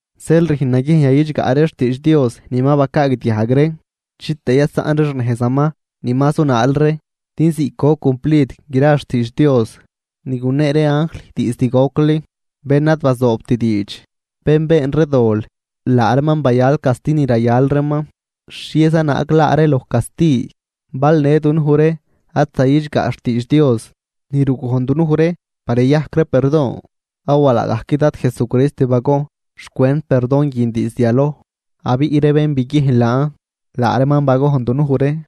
Zeel rüjn naguiejn yayidxgaꞌ ree xtiidx Dios ni ma bacaagdiajg ree chitëë yasaꞌn ree xnejzaman ni ma zunaal ree. Din ziꞌc goc cumplid gra xtiidx Dios ni gunee ree anjl diizd gocli, bén ad bazoobt diidx, bén been ree dol, laa reeman bayal casti ni rayal reeman. ¿Xhieza naag laa ree loj casti bal në dunuj ree ad zayidxgaꞌt xtiidx Dios ni rugojn dunuj ree par yayajc ree perdon? Awa laagajc Dad Jesucrist bagojn xcwent perdon guin diizd yaloj, abiꞌ ree bén biguiejn laan, laa reeman bagojn dunuj ree.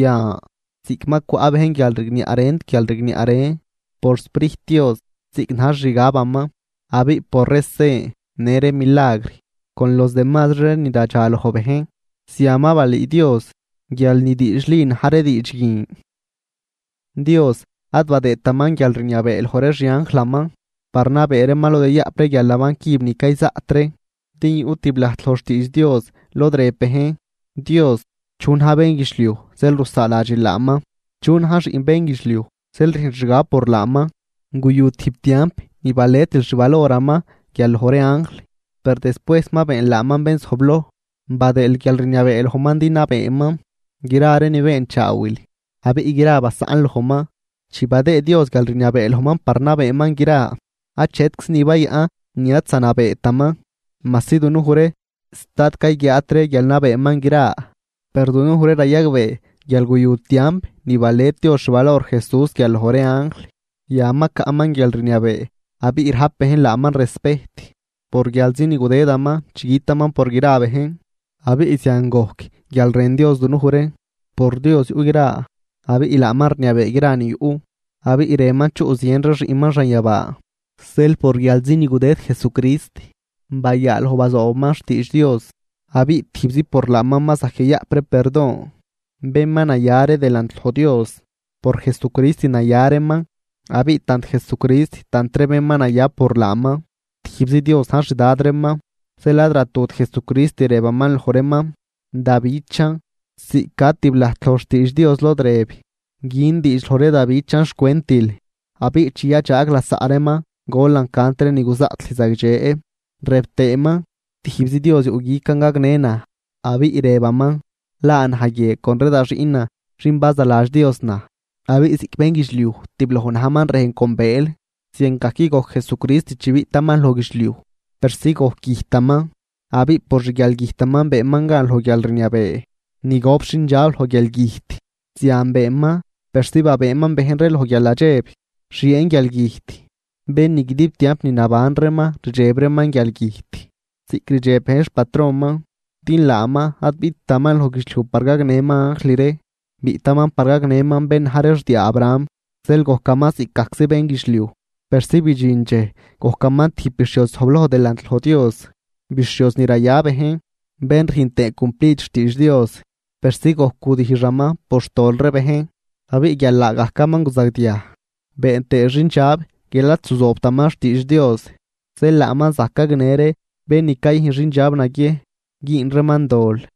Yan ziꞌc ma cwaꞌ bejn guialrigniaꞌ rent guialrigniaꞌ ren por xSprijt Dios ziꞌc na̱j xixgabaman, abiꞌ por ree sen në ree milagr con los demazri ree ni radxaloj bejn, zian ma balüü Dios guial ni diidxli na̱j ree diidx guin. Dios ad badëëtaman guialrniabee loj ree xianjlaman par nabee reeman lod yayaꞌp ree guialnaban cüb ni cayzaꞌt ree, din yuꞌ tiblajt loj xtiidx Dios lod rëb bejn: Dios, ¿chu na̱j bénguidxliuj zeel rusaaladxil laaman? ¿Chu na̱j xiꞌn bénguidxliuj zeel rüjnl xgab por laaman? Guyu tijb tiamp ni baletil xi valoraman guial loj ree anjl. Per despuejs ma beenl laaman bén zojbloj, badëël guialrniabee lojman din nabeeman gra ree ni beenchaawil, abiꞌ gra basaꞌnl lojman. Chi badëë Dios guialrniabee lojman par nabeeman gra, achetczi ni bayaꞌn ni ad zanabeetaman majsi dunuj ree sta ad cayguiaat ree guial nabeeman gra. Per dunuj ree rayagbee guial guyu tiamp ni balet Dios xvalor Jesús guial loj ree anjl. Yan ma caꞌman guialrniabee abiꞌ rajp bejn laaman respejt por guialzi ni gudëdaman chi gütaman por gra bejn, abiꞌ zian gojc guial rën Dios dunuj ree. Por Dios yuꞌ gra, abiꞌ laaman rniabee gra ni yuꞌ, abiꞌ rënman chuꞌ zien ree xiꞌnman xanyabaa. Zeel por guialzi ni gudëd Jesucrist bayaaloj bazoobaman xtiidx Dios, abiꞌ tijbzi por laaman ma zajc yayaꞌp ree perdon. Bén ma naya ree delant loj Dios, por Jesucrist naya reeman. Abiꞌ tant Jesucrist tant ree bén ma naya por laaman, tijbzi Dios na̱j xdad reeman. Zeel ad ratut Jesucrist rëbaman loj reeman: Da bichan. Ziꞌc ca tib lajt loj xtiidx Dios lod rëb: Gün diidx loj ree da bichan xcwentil, abiꞌ chi yadxaag lasaꞌ reeman golan cant ree ni guzaꞌt lüj zagdxe. Rëb tëëman: Tijbzi Dios yuꞌguican gagnë naj; abiꞌ rëbaman: Laa naj guie con ree da xiꞌnan xin bazaladx Dios naj. Abiꞌ ziꞌc bénguidxliuj tibloj najman rejn con bëël, ziangajc gojc Jesucrist chi biꞌtaman loj guidxliuj persi gojc güjtaman, abiꞌ por xguialgüjtaman beenman gan loj guialrniabee ni gop xindxab loj guialgüjt. Zian beenman persi babëëman bejn ree loj guialnadxeb xieen guialgüjt, bén ni guidib tiamp ni naban reeman rdxeb reeman guialgüjt ziꞌc rdxeb bejn xpatronman. Din laaman ad biꞌttaman loj guidxliuj par gagnëman anjl ree, biꞌtaman par gagnëman bén na̱j ree xdiaa Abraham. Zeel gojcaman ziꞌcgajczi bénguidxliuj, persi bidxin dxej gojcaman tijb bixhioz zojbloj delant loj Dios, bixhioz ni raya bejn, bén rüjn tëë cumplid xtiidx Dios persi gojc gudijxaman por xtol ree bejn. Abiꞌ guial laagajcaman guzagdiaj been tëë xindxab guial ad zuzoobtaman xtiidx Dios, zeel laaman zajc gagnë ree bén ni cayüjn xindxab naguiejn güün reeman dol.